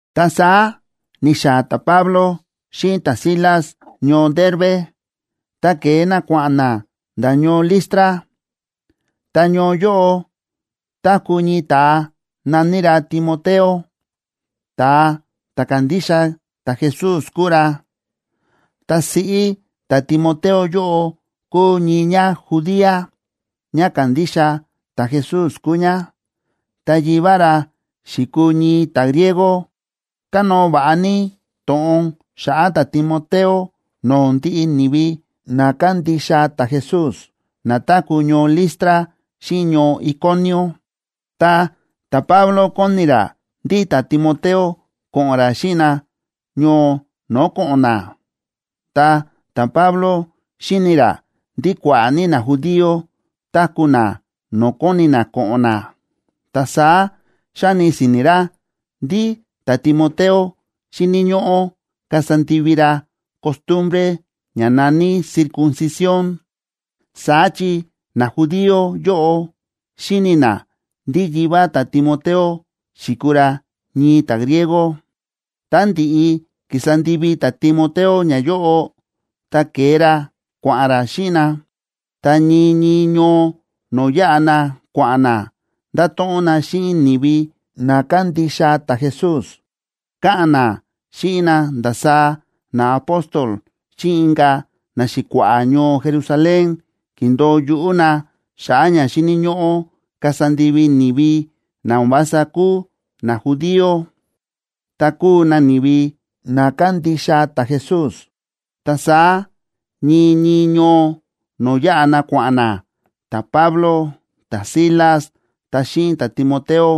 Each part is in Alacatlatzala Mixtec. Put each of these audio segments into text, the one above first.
Ta saá ni̱xaa̱ ta̱Pablo xíꞌin ta̱Silas ñoo Derbe, ta ke̱e na kua̱ꞌa̱n na nda̱ ñoo Listra. Ta ñoo yóꞌo táku̱ ñii ta̱a na̱ní ra Timoteo, ta̱a ta̱ kándixa ta̱Jesús kúu ra. Ta siꞌí ta̱Timoteo yóꞌo kúu ñii ñájudía, ñá kándixa ta̱Jesús kúu ñá, ta yivá ra xi̱kuu ñii ta̱griego. Kánóo va̱ꞌa ní to̱ꞌon xa̱ꞌa̱ ta̱Timoteo no̱o̱ ndiꞌi ni̱vi na kándixa ta̱Jesús na táku̱ ñoo Listra xíꞌin ñoo Iconio. Ta ta̱Pablo kóni ra ndí ta̱Timoteo ko̱ꞌo̱n ra xíꞌin na ñoo no̱o̱ ko̱ꞌo̱n na. Ta ta̱Pablo xíni̱ ra ndí kua̱ꞌa̱ ní najudío táku̱ na no̱o̱ kóni na ko̱ꞌo̱n na, ta saá xa̱ni si̱ni̱ ra ndí ta̱Timoteo xíni̱ ñóꞌó kasa ndivi ra costumbre ña na̱ní circuncisión. Saá chi najudío yóꞌo xíni̱ na ndí yivá ta̱Timoteo xi̱kuu ra ñii ta̱griego. Tá ndi̱ꞌi ki̱sa ndivi ta̱Timoteo ñayóꞌo, ta ke̱e ra kua̱ꞌa̱n ra xíꞌin na. Ta ñii ñii ñoo no̱o̱ yáꞌa na kua̱ꞌa̱n na, nda̱to̱ꞌon na xíꞌin ni̱vi na kándixa ta̱Jesús, káꞌa̱n na xíꞌin na ndasaá naapóstol xíꞌin inka̱ naxi̱kua̱ꞌa̱ ñoo Jerusalén ki̱ndo̱o yuꞌú na xa̱ꞌa̱ ña xíni̱ ñóꞌó kasa ndivi ni̱vi na o̱n vása kúu najudío, tá kúu na ni̱vi na kándixa ta̱Jesús. Ta saá ñii ñii ñoo no̱o̱ yáꞌa na kua̱ꞌa̱n na, ta̱Pablo, ta̱Silas ta xíꞌin ta̱Timoteo,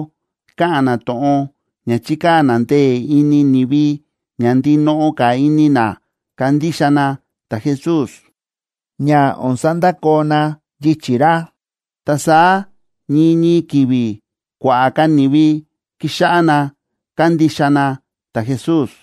káꞌa̱n na to̱ꞌon ña chíkaa̱ na ndee̱ ini ni̱vi ña ndinoꞌo ka̱ ini na kandixa na ta̱Jesús, ña o̱n sandakoo na yichi̱ ra. Ta saá ñii ñii ki̱vi̱ kua̱ꞌa̱ ka̱ ni̱vi ki̱xáꞌá na kándixa na ta̱Jesús.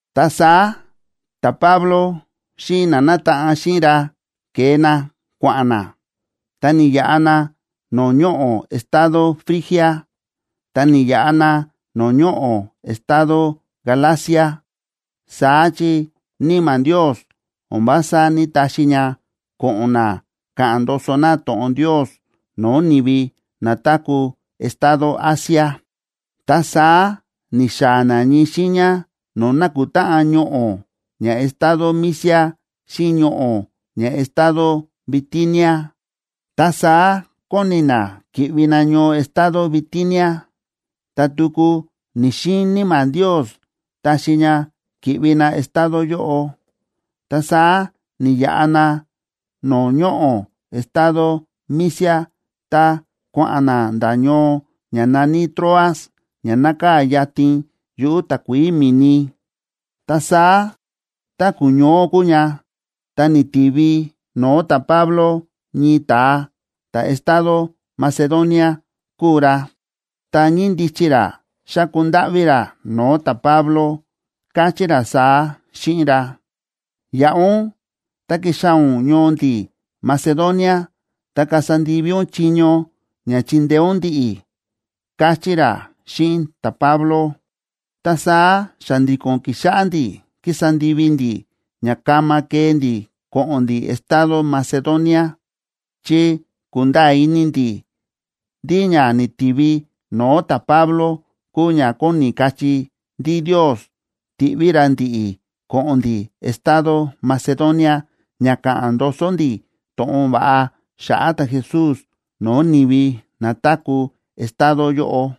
Ta saá ta̱Pablo xíꞌin na nátaꞌan xíꞌin ra ke̱e na kua̱ꞌa̱n na, ta ni̱yaꞌa na no̱o̱ ñoꞌo̱ estado Frigia, ta ni̱yaꞌa na no̱o̱ ñoꞌo̱ estado Galacia, saá chi Níma̱ Ndios o̱n vása ní‑taxi ña ko̱ꞌo̱n na ka̱ꞌa̱n ndoso na to̱ꞌon Ndios no̱o̱ ni̱vi na táku̱ estado Asia. Ta saá ni̱xaa̱ na ñii xiiña no̱o̱ nákutáꞌan ñoꞌo̱ ña estado Misia xíꞌin ñoꞌo̱ ña estado Bitinia, ta saá kóni na ki̱ꞌvi na ñoo estado Bitinia. Ta tuku ni̱‑xiin Níma̱ Ndios taxi ña ki̱ꞌvi na estado yóꞌo. Ta saá ni̱yaꞌa na no̱o̱ ñoꞌo̱ estado Misia ta kua̱ꞌa̱n na nda̱ ñoo ña na̱ní Troas, ña nákaa̱ yatin yuꞌu̱ takuií mi̱ni. Ta saá tá ku̱ñoó kúu ña, ta ni̱tivi no̱o̱ ta̱Pablo ñii ta̱a, ta̱ estado Macedonia kúu ra, ta ñíndichi ra xáku ndáꞌví ra no̱o̱ ta̱Pablo, káchí ra saá xíꞌin ra: “Yaꞌa ún ta kixaa̱ ún ñoo ndi̱ Macedonia, ta kasa ndivi ún chiño ña chindeé ún ndi̱ꞌi̱”, káchí ra xíꞌin ta̱Pablo. Ta saá xa̱ndi̱ko̱n ki̱xáꞌá ndi̱ kísa ndivi ndi̱ ña kama kee ndi̱ ko̱ꞌo̱n ndi̱ estado Macedonia, chi ku̱nda̱a̱ ini ndi̱ ndí ña ni̱tivi no̱o̱ ta̱Pablo kúu ña kóni kachí ndí Ndios tíꞌví ra ndi̱ꞌi̱ ko̱ꞌo̱n ndi̱ estado Macedonia ña ka̱ꞌa̱n ndoso ndi̱ to̱ꞌon va̱ꞌa xa̱ꞌa̱ ta̱Jesús no̱o̱ ni̱vi na táku̱ estado yóꞌo.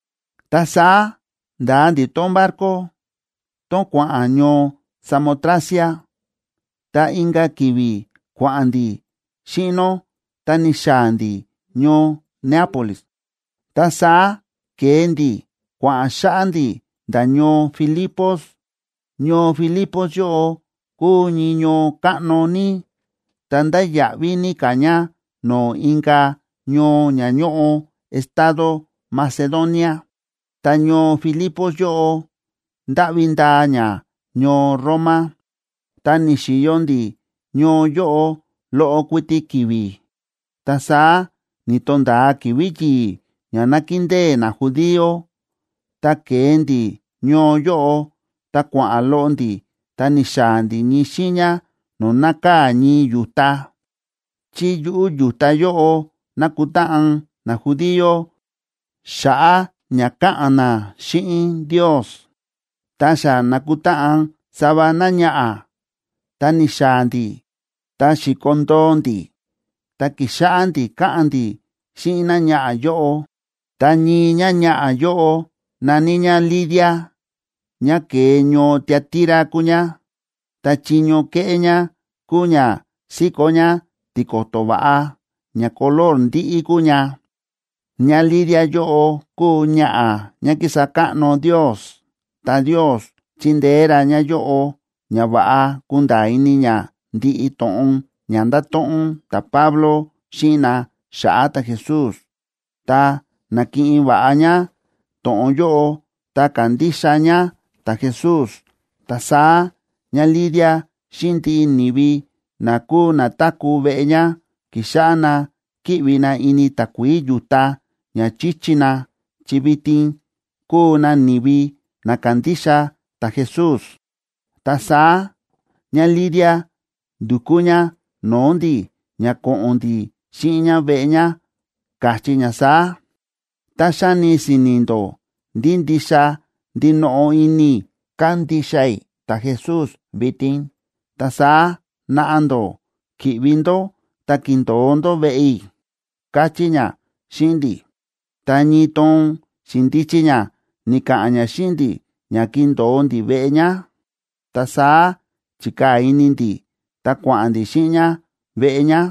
Ta saá nda̱a ndi̱ tón barco, tón kua̱ꞌa̱n ñoo Samotracia, ta inka̱ ki̱vi̱ kua̱ꞌa̱n ndi̱ xíꞌin nó, ta ni̱xaa̱ ndi̱ ñoo Neápolis. Ta saá ke̱e ndi̱ kua̱ꞌa̱n xáꞌá ndi̱ nda̱ ñoo Filipos. Ñoo Filipos yóꞌo kúu ñii ñoo káꞌno ní, ta ndáya̱ꞌví ní ka̱ ña no̱o̱ inka̱ ñoo ña ñóꞌo estado Macedonia. Ta ñoo Filipos yóꞌo ndáꞌvi ndaa ña ñoo Roma. Ta ni̱xi̱yo ndi̱ ñoo yóꞌo loꞌo kuiti ki̱vi̱. Ta saá ni̱to̱nda̱a ki̱vi̱ yi̱i̱ ña nákindée najudío, ta ke̱e ndi̱ ñoo yóꞌo ta kua̱ꞌa̱n loꞌo ndi̱ ta ni̱xaa̱ ndi̱ ñii xiiña no̱o̱ nákaa̱ ñii yu̱ta, chi yuꞌu̱ yu̱ta yóꞌo nákutáꞌan najudío xa̱ꞌa̱ ña ka̱ꞌa̱n na xíꞌin Ndios. Ta xa na̱kutáꞌan sava náñaꞌa̱, ta ni̱xaa̱ ndi̱ ta xi̱kondoo ndi̱, ta ki̱xáꞌá ndi̱ káꞌa̱n ndi̱ xíꞌin náñaꞌa̱ yóꞌo. Ta ñii ñáñaꞌa̱ yóꞌo na̱ní ñá Lidia, ñá ke̱e ñoo Tiatira kúu ñá, ta chiño kéꞌé ñá kúu ña síkó ñá tiko̱to̱ va̱ꞌa, ña color ndíꞌí kúu ña. ÑáLidia yóꞌo kúu ñaꞌa̱ ñá kísa káꞌno Ndios, ta Ndios chi̱ndeé ra ñáyóꞌo ña va̱ꞌa kunda̱a̱ ini ñá ndiꞌi to̱ꞌon ña nda̱to̱ꞌon ta̱Pablo xíꞌin na xa̱ꞌa̱ ta̱Jesús, ta na̱kiꞌin va̱ꞌa ñá to̱ꞌon yóꞌo, ta ka̱ndixa ñá ta̱Jesús. Ta saá ñáLidia xíꞌin ndiꞌi ni̱vi na kúu na táku̱ veꞌe ñá ki̱xáꞌá na kíꞌvi na ini takuií yu̱ta, ña chi̱chi na, chi vitin kúu na ni̱vi na kándixa ta̱Jesús. Ta saá ñáLidia ndu̱kú ñá no̱o̱ ndi̱ ña ko̱ꞌo̱n ndi̱ xíꞌin ñá veꞌe ñá, káchí ñá saá: ―Tá xáni si̱ni̱ ndó ndí ndixa ndinoꞌo ini i̱ kándixa i̱ ta̱Jesús vitin, ta saá naꞌa ndó ki̱ꞌvi ndó ta kindo̱o ndó veꞌe i̱ ―káchí ñá xíꞌin ndi̱. Ta ñii toon xi̱ndichi ñá ni̱ka̱ꞌa̱n ñá xíꞌin ndi̱ ña kindo̱o ndi̱ veꞌe ñá, ta saá chi̱kaa̱ ini ndi̱, ta kua̱ꞌa̱n ndi̱ xíꞌin ñá veꞌe ñá.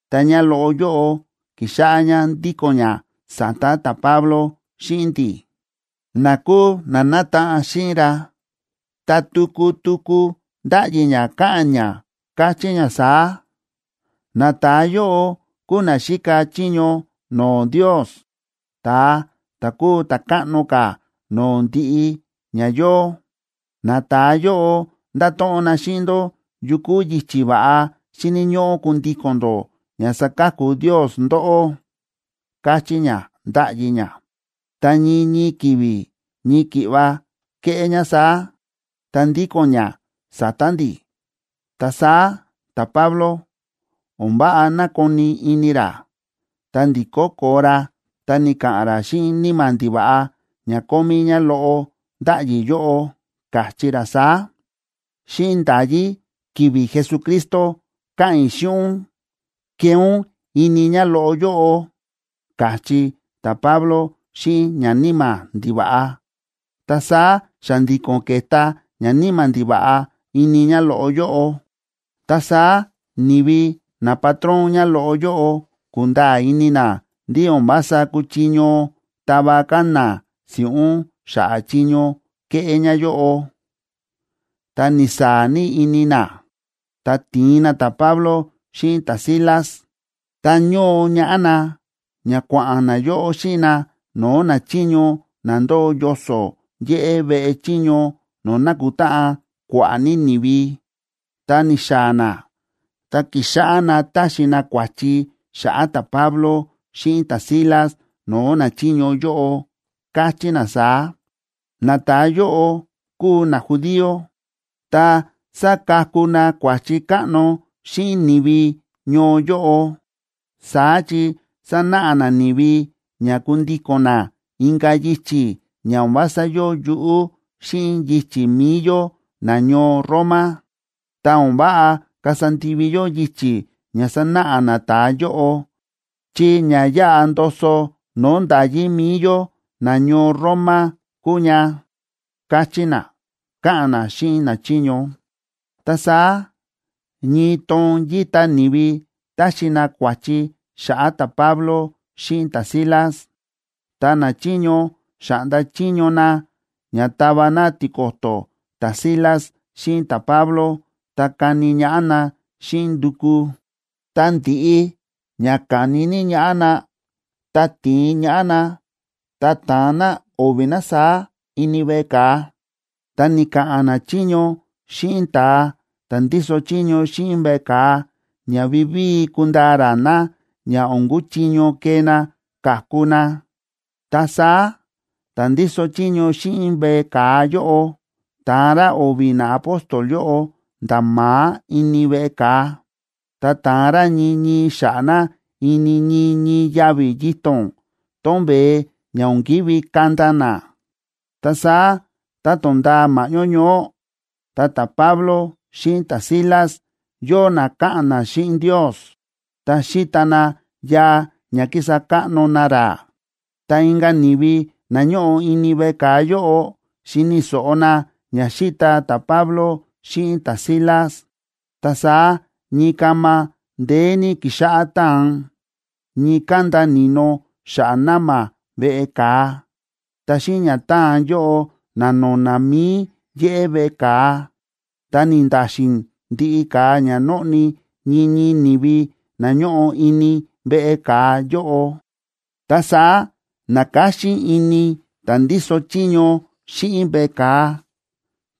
Ta ñáloꞌo yóꞌo ki̱xáꞌá ñá ndíko̱n ñá sa̱ta̱ ta̱Pablo xíꞌin ndi̱ꞌi̱, na kúu na nátaꞌan xíꞌin ra, ta tuku tuku ndáꞌyi ñá káꞌa̱n ñá, káchí ñá saá: ―Nata̱a yóꞌo kúu na xíka chiño no̱o̱ Ndios, ta̱a ta̱ kúu ta̱ káꞌno ka̱ no̱o̱ ndiꞌi ña yóo. Nata̱a yóꞌo ndáto̱ꞌon na xíꞌin ndó yu kúu yichi̱ va̱ꞌa xíni̱ ñóꞌó kundíko̱n ndó ña saka̱ku Ndios ndóꞌó ―káchí ñá, ndáꞌyi ñá. Ta ñii ñii ki̱vi̱ ñii ki̱ꞌva kéꞌé ñá saá, ta ndíko̱n ñá sa̱ta̱ ndi̱. Ta saá ta̱Pablo, o̱n váꞌa na̱koni ini ra, ta ndi̱kó koo ra ta ni̱ka̱ꞌa̱n ra xíꞌin níma̱ ndiva̱ꞌa ña kómí ñáloꞌo ndáꞌyi yóꞌo, káchí ra saá: ―Xíꞌin nda̱yí ki̱vi̱ Jesucristo káꞌa̱n i̱ xíꞌin ún, kee ún ini ñáloꞌo yóꞌo ―káchí ta̱Pablo xíꞌin ñaníma̱ ndiva̱ꞌa. Ta saá xa̱ndi̱ko̱n ke̱ta ñaníma̱ ndiva̱ꞌa ini ñáloꞌo yóꞌo. Ta saá ni̱vi napatrón ñáloꞌo yóꞌo ku̱nda̱a̱ ini na ndí o̱n vása kúchiño tava ka̱ na si̱ꞌún xa̱ꞌa̱ chiño ke̱ꞌé ñáyóꞌo, ta ni̱saa̱ ní ini na. Ta ti̱in na ta̱Pablo xíꞌin ta̱Silas, ta ñóo ñaꞌá na, ña kua̱ꞌa̱n nayóꞌo xíꞌin na no̱o̱ nachiño na ndóo yoso̱ yéꞌé veꞌe chiño no̱o̱ nákutáꞌan kua̱ꞌa̱ ní ni̱vi. Tá ni̱xaa̱ na, ta ki̱xáꞌá na táxi na kua̱chi xa̱ꞌa̱ ta̱Pablo xíꞌin ta̱Silas no̱o̱ nachiño yóꞌo, káchí na saá: ―Nata̱a yóꞌo kúu najudío, ta sa̱kaku na kua̱chi káꞌno xíꞌin ni̱vi ñoo yóꞌo. Saá chi sánáꞌa na ni̱vi ña kundíko̱n na inka̱ yichi̱ ña o̱n vása yóo yuꞌú xíꞌin yichi̱ mi̱i yó nañoo Roma. Ta o̱n váꞌa kasa ndivi yó yichi̱ ña sánáꞌa nata̱a yóꞌo, chi ña yáꞌa ndoso no̱o̱ nda̱yí mi̱i yó nañoo Roma kúu ña ―káchí na, káꞌa̱n na xíꞌin nachiño. Ta saá ñii toon yíta ni̱vi táxi na kua̱chi xa̱ꞌa̱ ta̱Pablo xíꞌin ta̱Silas. Ta nachiño xa̱ꞌnda chiño na ña tava na tiko̱to̱ ta̱Silas xíꞌin ta̱Pablo ta kani ñaꞌá na xíꞌin nduku. Ta ndi̱ꞌi ña ka̱ni ní ñaꞌá na, ta ti̱in ñaꞌá na, ta ta̱an na o̱vi̱ na saá ini veꞌe ka̱a. Ta ni̱ka̱ꞌa̱n nachiño xíꞌin ta̱a ta̱ ndíso chiño xíꞌin veꞌe ka̱a ña vivíi kundaa ra na ña o̱n kuchiño kee na ka̱ku na. Ta saá ta̱ ndíso chiño xíꞌin veꞌe ka̱a yóꞌo ta̱an ra o̱vi̱ naapóstol yóꞌo nda̱ ma̱á ini veꞌe ka̱a, ta ta̱an ra ñii ñii xa̱ꞌa̱ na ini ñii ñii yavi̱ yito̱n tón veé ña o̱n ki̱ví kanda na. Ta saá tá to̱nda̱a ma̱ꞌñó ñoó, ta̱Pablo xíꞌin ta̱Silas yóo na káꞌa̱n na xíꞌin Ndios ta xíta na yaa ña kísa káꞌno na ra. Ta inka̱ ni̱vi na ñóꞌo ini veꞌe ka̱a yóꞌo, xíni̱ so̱ꞌo na ña xíta ta̱Pablo xíꞌin ta̱Silas. Ta saá ñii kama ndeé ní ki̱xáꞌá táan, ñii kánda ni̱no xa̱ꞌa̱ na̱ma̱ veꞌe ka̱a. Ta xíꞌin ña táan yóꞌo, na̱no̱na̱ mi̱i yéꞌé veꞌe ka̱a, ta ni̱nda̱xi̱n ndiꞌi ka̱a ña nóꞌni ñii ñii ni̱vi na ñóꞌo ini veꞌe ka̱a yóꞌo. Ta saá na̱káxín ini ta̱ ndíso chiño xíꞌin veꞌe ka̱a,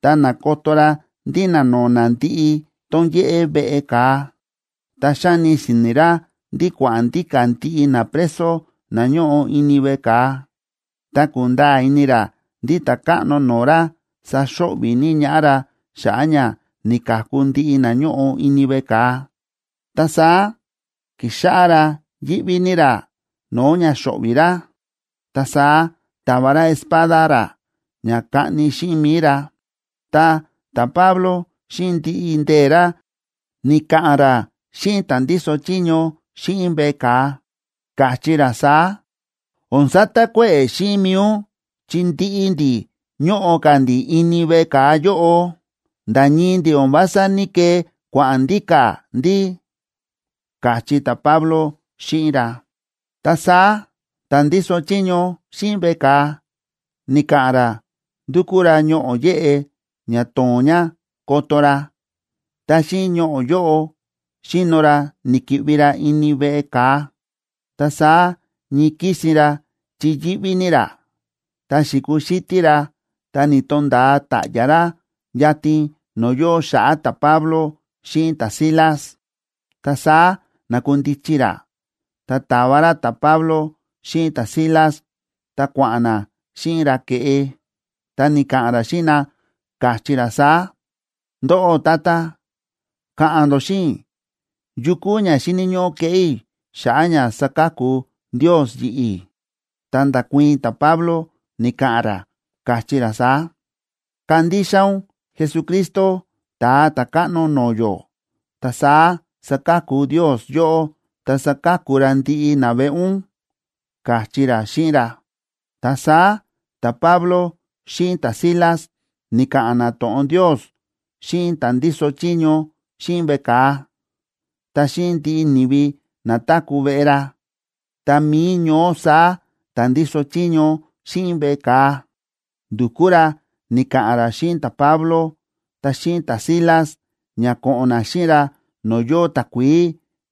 ta na̱koto ra ndí na̱no̱na̱ ndiꞌi tón yéꞌé veꞌe ka̱a, ta xa̱ni si̱ni̱ ra ndí kua̱ꞌa̱n ndíka̱ ndiꞌi napreso na ñóꞌo ini veꞌe ka̱a. Ta kúnda̱a̱ ini ra ndí ta̱káꞌno no̱o̱ ra saxo̱ꞌvi̱ ní ñaꞌá ra xa̱ꞌa̱ ña ni̱ka̱ku ndiꞌi na ñóꞌo ini veꞌe ka̱a, ta saá ki̱xáꞌá ra yíꞌví ní ra no̱o̱ ña xo̱ꞌvi̱ ra. Ta saá ta̱va ra espada ra ña kaꞌni xíꞌin mi̱i ra. Ta ta̱Pablo xíꞌin ndiꞌi ndee̱ ra, ni̱ka̱ꞌa̱n ra xíꞌin ta̱ ndíso chiño xíꞌin veꞌe ka̱a, káchí ra saá: ―O̱n satakuéꞌe̱ xíꞌin mi̱i ún chi ndiꞌi ndi̱ ñóꞌo ka̱ ndi̱ ini veꞌe ka̱a yóꞌo. Nda̱ ñii ndi̱ o̱n vása ní‑kee kua̱ꞌa̱n ndíka̱ ndi̱ ―káchí ta̱Pablo xíꞌin ra. Ta saá ta̱ ndíso chiño xíꞌin veꞌe ka̱a ni̱ka̱ꞌa̱n ra ndu̱kú ra ñoꞌo̱ yéꞌe ña tóo̱n ña koto ra, ta xíꞌin ñoꞌo̱ yóꞌo xi̱no ra ni̱ki̱ꞌvi ra ini veꞌe ka̱a. Ta saá ñii kísin ra, chi yíꞌví ní ra, ta xi̱kuxítí ra ta ni̱to̱nda̱a ta̱ꞌya̱ ra yatin no̱o̱ yóo xa̱ꞌa̱ ta̱Pablo xíꞌin ta̱Silas. Ta saá na̱kundichi ra, ta ta̱va ra ta̱Pablo xíꞌin ta̱Silas, ta kua̱ꞌa̱n na xíꞌin ra ke̱ꞌe, ta ni̱ka̱ꞌa̱n ra xíꞌin na, káchí ra saá: ―Ndóꞌó tata, ka̱ꞌa̱n ndó xíꞌin i̱, ¿yu kúu ña xíni̱ ñóꞌó keꞌé i̱ xa̱ꞌa̱ ña saka̱ku Ndios yi̱ꞌi̱? Ta nda̱kuii̱n ta̱Pablo ni̱ka̱ꞌa̱n ra, káchí ra saá: ―Kandixa ún Jesucristo, Ta̱a Ta̱káꞌno no̱o̱ yó, ta saá saka̱ku Ndios yóꞌó, ta saka̱ku ra ndiꞌi naveꞌe ún ―káchí ra xíꞌin ra. Ta saá ta̱Pablo xíꞌin ta̱Silas ni̱ka̱ꞌa̱n na to̱ꞌon Ndios xíꞌin ta̱ ndíso chiño xíꞌin veꞌe ka̱a, ta xíꞌin ndiꞌi ni̱vi na táku̱ veꞌe ra. Ta mi̱i ñoó saá ta̱ ndíso chiño xíꞌin veꞌe ka̱a, ndu̱kú ra ni̱ka̱ꞌa̱n ra xíꞌin ta̱Pablo ta xíꞌin ta̱Silas, ña ko̱ꞌo̱n na xíꞌin ra no̱o̱ yóo takuií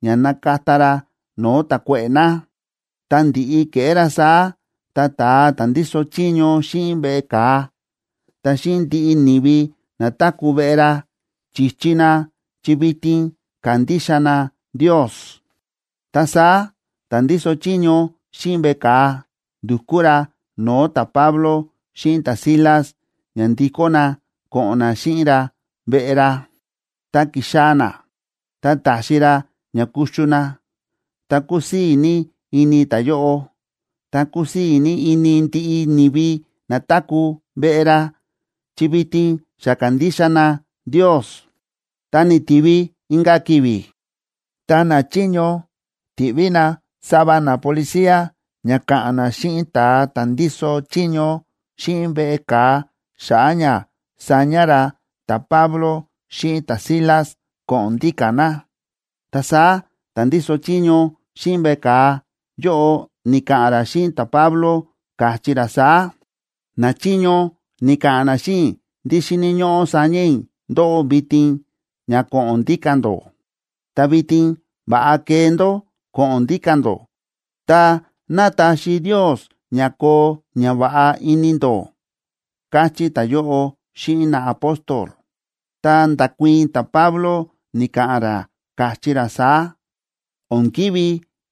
ña nakata ra no̱o̱ ta̱kuéꞌe̱ na. Ta ndi̱ꞌi ke̱ꞌé ra saá, ta ta̱a ta̱ ndíso chiño xíꞌin veꞌe ka̱a, ta xíꞌin ndiꞌi ni̱vi na táku̱ veꞌe ra, chi̱chi na chi vitin ka̱ndixa na Ndios. Ta saá ta̱ ndíso chiño xíꞌin veꞌe ka̱a ndu̱kú ra no̱o̱ ta̱Pablo xíꞌin ta̱Silas ña ndikó na ko̱ꞌo̱n na xíꞌin ra veꞌe ra. Tá ki̱xaa̱ na, ta ta̱xi ra ña kuxu na. Ta kúsii̱ ní ini ta̱yóꞌo, ta kúsii̱ ní ini ndiꞌi ni̱vi na táku̱ veꞌe ra, chi vitin xa ka̱ndixa na Ndios. Ta ni̱tivi inka̱ ki̱vi̱, ta nachiño ti̱ꞌví na sava napolicía ña ka̱ꞌa̱n na xíꞌin ta̱a ta̱ ndíso chiño xíꞌin veꞌe ka̱a xa̱ꞌa̱ ña saña ra ta̱Pablo xíꞌin ta̱Silas ko̱ꞌo̱n ndíka̱ na. Ta saá ta̱ ndíso chiño xíꞌin veꞌe ka̱a yóꞌo ni̱ka̱ꞌa̱n ra xíꞌin ta̱Pablo, káchí ra saá: ―Nachiño ni̱ka̱ꞌa̱n na xíꞌin i̱ ndí xíni̱ ñóꞌó saña i̱ ndóꞌó vitin ña ko̱ꞌo̱n ndíka̱ ndó. Ta vitin va̱ꞌa kee ndó ko̱ꞌo̱n ndíka̱ ndó, ta ná taxi Ndios ña koo ñava̱ꞌa ini ndó ―káchí ta̱yóꞌo xíꞌin naapóstol. Ta nda̱kuii̱n ta̱Pablo ni̱ka̱ꞌa̱n ra, káchí ra saá: ―O̱n ki̱ví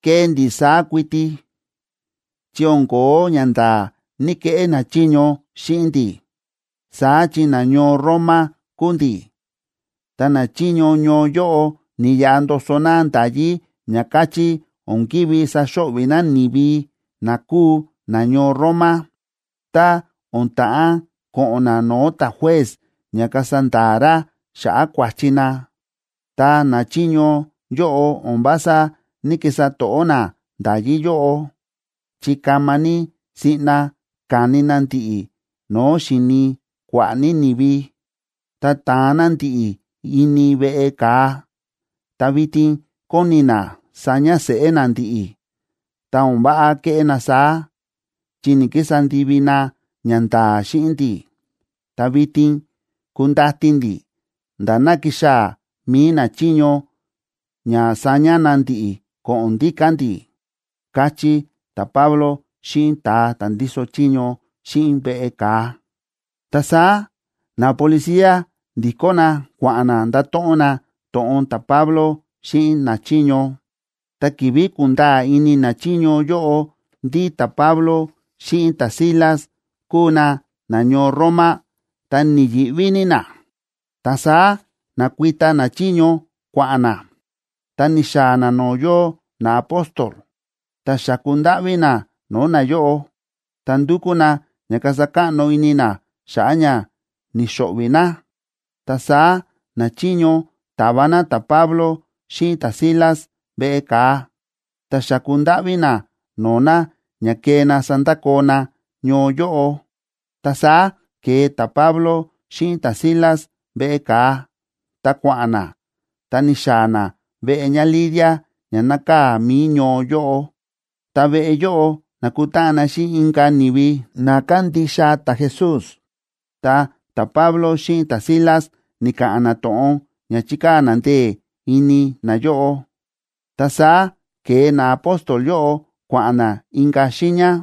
kee ndi̱ saá kuiti, chi o̱n ko̱ó ñanda̱a̱ ní‑keꞌé nachiño xíꞌin ndi̱, saá chi nañoo Roma kúu ndi̱. Ta nachiño ñoo yóꞌo ni̱yaꞌa ndoso na nda̱yí ña káchí o̱n ki̱ví saxo̱ꞌvi̱ na ni̱vi na kúu nañoo Roma, tá o̱n ta̱ꞌán ko̱ꞌo̱n na no̱o̱ ta̱juez ña kasa nda̱a̱ ra xa̱ꞌa̱ kua̱chi na. Ta nachiño yóꞌo o̱n vása ní‑kisa to̱ꞌó na nda̱yí yóꞌo, chi kama ní siꞌna ka̱ni na ndi̱ꞌi̱ no̱o̱ xíni kua̱ꞌa̱ ní ni̱vi, ta ta̱an na ndi̱ꞌi̱ ini veꞌe ka̱a. Ta vitin kóni na saña seꞌé na ndi̱ꞌi̱, ta o̱n váꞌa keꞌé na saá, chi ni̱‑kisa ndivi na ñanda̱a̱ xíꞌin ndi̱. Ta vitin kundati ndi̱ nda̱ ná kixaa̱ mi̱i nachiño ña saña na ndi̱ꞌi̱ ko̱ꞌo̱n ndíka̱ ndi̱ ―káchí ta̱Pablo xíꞌin ta̱a ta̱ ndíso chiño xíꞌin veꞌe ka̱a. Ta saá napolicía ndi̱kó na kua̱ꞌa̱n na nda̱to̱ꞌon na to̱ꞌon ta̱Pablo xíꞌin nachiño. Ta ki̱vi̱ kúnda̱a̱ ini nachiño yóꞌo ndí ta̱Pablo xíꞌin ta̱Silas kúu na nañoo Roma, ta ni̱yi̱ꞌví ní na. Ta saá na̱kuita nachiño kua̱ꞌa̱n na, ta ni̱xaa̱ na no̱o̱ yóo naapóstol, ta xa̱ku ndáꞌví na no̱o̱ nayóꞌo, ta ndu̱kú na ña kasa káꞌno ini na xa̱ꞌa̱ ña ni̱xo̱ꞌvi̱ na. Ta saá nachiño ta̱va na ta̱Pablo xíꞌin ta̱Silas veꞌe ka̱a, ta xa̱ku ndáꞌví na no̱o̱ na ña kee na sandakoo na ñoo yóꞌo. Ta saá ke̱e ta̱Pablo xíꞌin ta̱Silas veꞌe ka̱a, ta kua̱ꞌa̱n na, ta ni̱xaa̱ na veꞌe ñáLidia ña nákaa̱ mi̱i ñoo yóꞌo. Ta veꞌe yóꞌo na̱kutáꞌan na xíꞌin inka̱ ni̱vi na kándixa ta̱Jesús, ta ta̱Pablo xíꞌin ta̱Silas ni̱ka̱ꞌa̱n na to̱ꞌon ña chi̱kaa̱ na ndee̱ ini nayóꞌo. Ta saá ke̱e naapóstol yóꞌo kua̱ꞌa̱n na inka̱ xiiña.